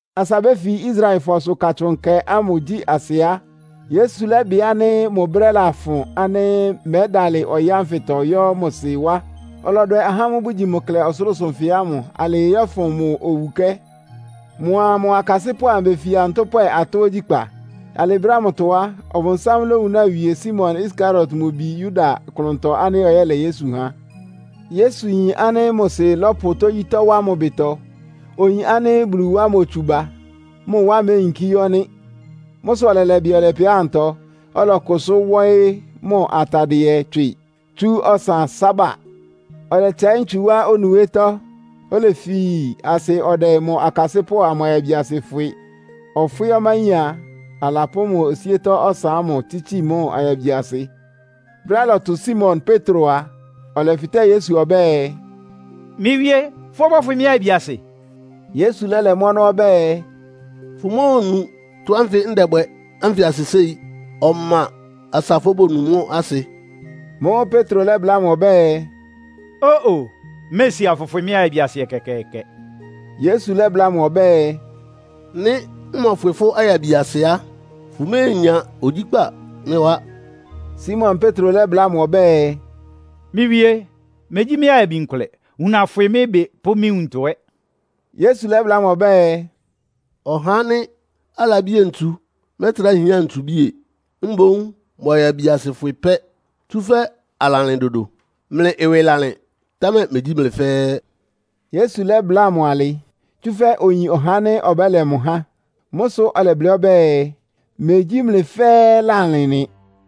Asa béfi Israelfɔsʋ Katsʋn Nkɛ ámʋ gyí asɩ á, Yesu lɛ́bɩ ánɩ́ mʋ brɛ́ lafʋn ánɩ́ mɛ́dalɩ ɔyɩ́ ánfɩtɔ yɔ́ mʋ Sɩ wá. Ɔlɔdwɛ ahá ámʋ́ʋ́ bʋgyi mʋ klɛ ɔsʋlʋ́sʋ nfɩ ámʋ alɩɩ yɔ́fʋn mʋ owukɛ́. Mʋa mʋ akasɩ́pʋ́ amʋ befia ntʋ́pwɛ atɔ́ ogyíkpá. Alɩ brɛ́ ámʋtɔ á, ɔbʋnsám lawúna wie Simon Iskariot mʋ bi Yuda klʋntɔ ánɩ́ ɔyɛ́lɛ Yesu ha. Yesu yin ánɩ́ mʋ Sɩ lɔ́pʋ tógyítɔ́ wá mʋ ɩbɩtɔ. Oyin ánɩ́ Bulu wá motsu ba, mʋ wá méyinkí yɔ́ nɩ́. Mʋ́ sʋ ɔlɛlɛ ɩbɩ ɔlɛpɛ ámʋtɔ, ɔlɔkʋsʋ́ wɔ́ɩ́ mʋ atadɩɛ tswɩ, tsú ɔsan sába. Ɔlɛtsɛɩ́ ntsu wá onuwétɔ́, olefi asɩ ɔdɛ mʋ akasɩ́pʋ́ amʋ ayabiasɩ fwɩ. Ɔfwɩ́ ɔmáyín a, alapʋ́ mʋ osíétɔ́ ɔsan ámʋ tsítsi mʋ ayabiasɩ. Brɛ́á ɩlɔtʋ Simon Petro a, ɔlɛfɩtɛ́ Yesu ɔbɛ́ɛ, “Mɩ́ Wíé, fʋ́ ɔbɔ́fwɩ mɩ́ ayabiasɩ?” Yesu lɛ́lɛ mʋ́ ɔnɔ́ ɔbɛ́ɛ, “Fʋmóonu tɔ́ ánfɩ ndɛbwɛ ánfɩ asɩ séi. Ɔma asa fóbonu mʋ́ asɩ.” Mʋ́ʋ́ Petro lɛ́bláa mʋ ɔbɛ́ɛ, “Ó-o! Mméesi, afʋfwɩ mɩ́ ayabiasɩ ɛkɛkɛɛkɛ.” Yesu lɛ́bláa mʋ ɔbɛ́ɛ, “Nɩ́ mmɔfwɩ fʋ́ ayabiasɩ á, fʋméenya ogyíkpa mɩ́ wá.” Simon Petro lɛ́bláa mʋ ɔbɛ́ɛ, “Mɩ́ Wíé, megyí mɩ́ ayabi nkʋlɛ. Wuna fwɩ mɩ́ ɩbɩ pʋ́ mɩ́ nwuntɔ ɛ́.” Yesu lɛ́bláa mʋ ɔbɛ́ɛ, “Ɔhá ánɩ́ alabie ntsu mɛ́trá hián ntsubíe. Mboún mʋ ayabiasɩ fwɩ pɛ́, tsúfɛ́ alalɩn dodo. Mlɩ ɩwɩ lalɩn, támɛ megyí mlɩ fɛ́ɛ́.” (Yesu lɛ́bláa mʋ alɩ, tsúfɛ́ oyin ɔhá ánɩ́ ɔbɛ́lɛ mʋ há. Mʋ́ sʋ ɔlɛblɩ́ ɔbɛ́ɛ, “Megyí mlɩ fɛ́ɛ́ lálɩn” nɩ.)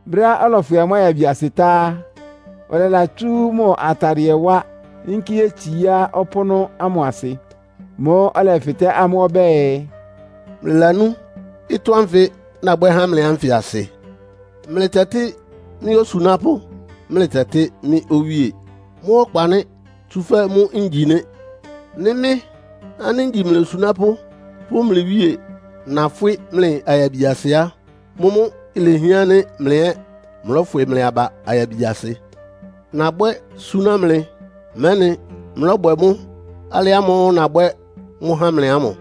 Brɛ́á ɔlɔfwɩ amʋ́ ayabiasɩ tá á, ɔlɛlatsú mʋ atadɩɛ wá, yínkí yétsiá ɔpʋ́nʋ́ ámʋ asɩ. Mʋ́ʋ́ ɔlɛfɩtɛ́ amʋ́ ɔbɛ́ɛ, “Mlɩlanú ɩtɔ́ ánfɩ nabwɛ́ há mlɩ ánfɩ asɩ? Mlɩtɛtɩ́ mɩ́ ‘Osunápʋ́,’ mlɩtɛtɩ́ mɩ́ ‘Owíé.’ Mʋ́ ɔkpa nɩ́, tsúfɛ́ mʋ́ ngyi nɩ́. Nɩ́ mɩ́ ánɩ́ ngyi mlɩ osunápʋ́ pʋ́ mlɩ Wíe, nafwɩ́ mlɩ ayabiasɩ á, mʋ́mʋ́ ilehián ánɩ́ mlɩ ɛ́ mlɔ́fwɩ mlɩ aba ayabiasɩ. Nabwɛ́ súná mlɩ, mɛ́nɩ mlɔ́bwɛ mʋ́ alɩ ámʋ́ʋ́ nabwɛ́ mʋ́ há mlɩ ámʋ.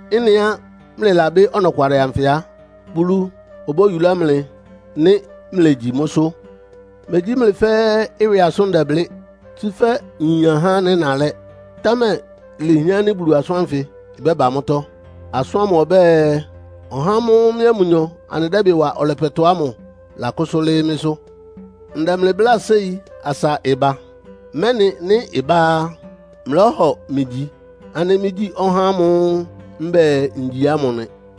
Ɩ́nɩá mlɩlabɩ́ ɔnɔkwalɩ anfɩ á, Bulu obóyulá mlɩ nɩ́ mlegyi mʋ́sʋ́. “Megyí mlɩ fɛ́ɛ́ ɩwɩ asʋ́n ndɛblɩ́. Tsúfɛ́ nyin ahá ánɩ́ nalɛ́. Támɛ lehián ánɩ́ Bulu asʋ́n ánfɩ ɩbɛ́ba mʋ́tɔ́. Asʋ́n ámʋ ɔbɛ́ɛ, ‘Ɔhá ámʋ́ʋ́ mɩ́a mʋnyɔ anɩdɛ́ ɩbɩ wa ɔlɛpɛtɔ ámʋ lakʋ́sʋ́ lɩ́ɩ́ mɩ́sʋ́.’ Ndɛ mlɩ bláa séi asa ɩba, mɛ́nɩ nɩ́ ɩbá á, mlɔ́hɔ mɩ gyi ánɩ́ mɩ́gyí ɔhá ámʋ́ʋ́ mbɛ́ɛ ngyi ámʋ nɩ.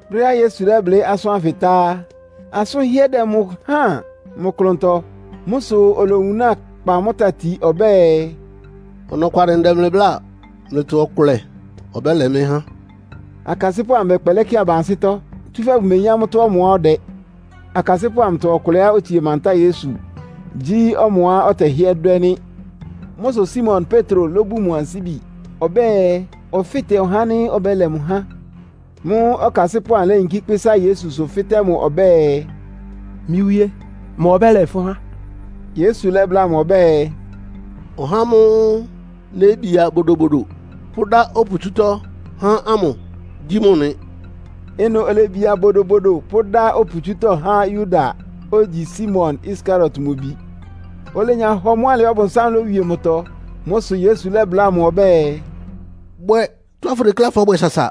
Brɛ́á Yesu lɛ́blɩ́ asʋ́n ánfɩ tá á, asʋ́n ɩhɩ́ɛ́ dɛ mʋ háan mʋ klʋntɔ. Mʋ́ sʋ olowunáa kpa mʋ́ tati ɔbɛ́ɛ, “Ɔnɔkwalɩ ndɛ mlɩ bláa, mlɩtɔ ɔkʋlɛ ɔbɛ́lɛ mɩ́ há.” Akasɩ́pʋ́ amʋ bɛkpɛlɛ́ kɩ aba ansɩ́tɔ́, tsúfɛ́ bʋmeyín amʋ́tɔ́ ɔmʋá ɔdɛ. Akasɩ́pʋ́ amʋtɔ ɔkʋlɛá otsie mantáa Yesu, gyí ɔmʋá Yesu tɛhɩ́ɛ́ dwɛ́ nɩ́. Mʋ́ sʋ Simon Petro lóbun mʋ ansíbi ɔbɛ́ɛ, ɔfɩ́tɛ mʋ ɔhá ánɩ́ ɔbɛ́lɛ mʋ há. Mʋ́ʋ́ ɔkasɩ́pʋ́ amʋ léyinkí kpɩ́sá Yesusʋ, fɩ́tɛ́ mʋ ɔbɛ́ɛ, “Mɩ́ Wíé, ma ɔbɛ́lɛ fʋ́ há?” Yesu lɛ́bláa mʋ ɔbɛ́ɛ, “Ɔhá ámʋ́ʋ́ nébia bodobodo, pʋ́dá oputsútɔ́ há ámʋ gyí mʋ nɩ.” Ɩnʋ olebia bodobodo pʋ́dá oputsútɔ́ há Yuda, ogyi Simon Iskariot mʋ bi. Olenya hɔ mʋ́ alɩ, Ɔbʋnsám lówie mʋtɔ. Mʋ́ sʋ Yesu lɛ́bláa mʋ ɔbɛ́ɛ, “Bwɛ tɔ́á fʋdekléá fɔ́bwɛ sasa!”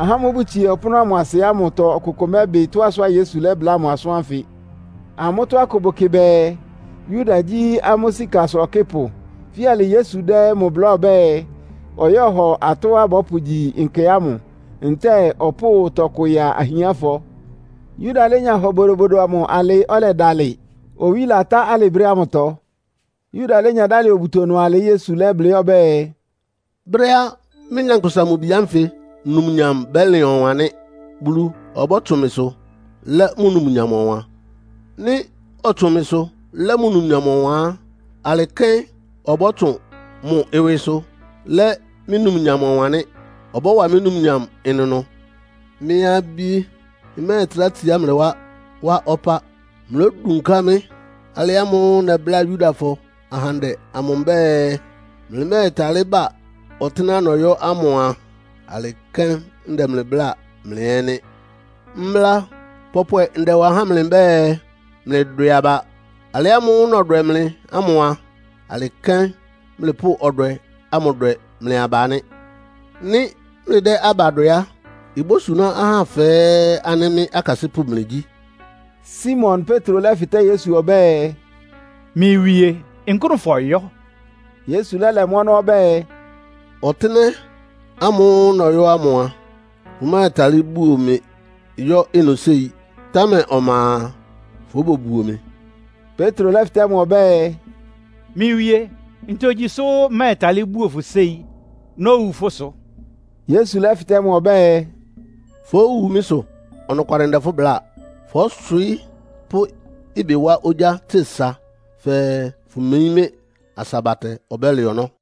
Ahá ámʋ́ʋ́ bʋtsie ɔpʋ́nʋ́ ámʋ asɩ ámʋtɔ ɔkʋkʋ mɛ́bɩ tɔ́á sʋá Yesu lɛ́bláa mʋ asʋ́n ánfɩ. Amʋ́tɔ́ akʋ bʋkɩ bɛɛ, Yuda gyí amʋ́ sikasʋ ɔkɩ́pʋ. Fíalɩ Yesu dɛ́ mʋ bláa ɔbɛ́ɛ, ɔyɔ́hɔ atɔ́á bɔ́pʋgyi nkɛ ámʋ, ntɛ́ɛ ɔpʋ́ʋ tɔkʋ ya ahiánfɔ. Yuda lénya hɔ bodobodo amʋ alɩ́, ɔlɛdalɩ. Owí latá alɩ brɛ́ ámʋ. Yuda lénya dálɩ obuto ɩnʋ alɩ Yesu lɛ́blɩ́ ɔbɛ́ɛ, “Brɛ́á Mɩ́, Nyankpʋsa-Mʋ-Bi ánfɩ numnyam bɛ́lɩn ɔwan nɩ́. Bulu ɔbɔ́tsʋn mɩsʋ lɛ́ mʋ numnyam ɔwan. Nɩ́ ɔtsʋn mɩsʋ lɛ́ mʋ numnyam ɔwan á, alɩ kɛ́n ɔbɔ́tsʋn mʋ ɩwɩsʋ lɛ́ mɩ́ numnyam ɔwan nɩ́. Ɔbɔ́wa mɩ́ numnyam ɩnʋnʋ. Mɩ́ abí, mmɛ́ɛtrá tsiá mlɩ wá, wá ɔpá. Mlódunká mɩ́. Alɩ ámʋ́ʋ́ nɛbláa Yudafɔ ahandɛ amʋ mbɛ́ɛ, ‘Mlɩmɛ́ɛtalɩ́ ba ɔtɩ́nɛ́á nɔyɔ́ ámʋ’ a, alɩ kɛ́n ndɛ mlɩ bláa mlɩ ɛ́ nɩ́. Mbla pɔpwɛ ndɛwa há mlɩ mbɛ́ɛ, mlɩdwɛ aba. Alɩ ámʋ́ʋ́ nɔdwɛ mlɩ ámʋ a, alɩ kɛ́n mlɩpʋ́ ɔdwɛ ámʋ dwɛ mlɩ aba nɩ́. Nɩ́ mlɩdɛ́ aba dwɛ á, ibósuná ahá fɛ́ɛ́ ánɩ́ mɩ́ akasɩ́pʋ́ mlɩgyí.” Simon Petro lɛ́fɩtɛ́ Yesu ɔbɛ́ɛ, “Mɩ́ Wíé, nkʋ́nʋ fɔyɔ́?” Yesu lɛ́lɛ mʋ́ ɔnɔ́ ɔbɛ́ɛ, “Ɔtɩ́nɛ́ ámʋ́ʋ́ nɔyɔ́ ámʋ a, fʋmɛ́ɛtalɩ́ buo mɩ yɔ́ ɩnʋ séi. Támɛ ɔma a, fóbobuo mɩ.” Petro lɛ́fɩtɛ́ mʋ ɔbɛ́ɛ, “Mɩ́ Wíé, ntogyi sʋ́ mmɛ́ɛtalɩ́ buo fʋ séi. Nówu fʋ́ sʋ!” Yesu lɛ́fɩtɛ́ mʋ ɔbɛ́ɛ, “Fówu mɩ́ sʋ? Ɔnɔkwalɩ ndɛ fʋ́ bláa. Fɔ́swɩɩ́ pʋ́ ɩbɩ wá ogyá tse sa fɛɛ fʋmeyín mɩ́ asa batɛ ɔbɛ́lɛ ɔnɔ́.”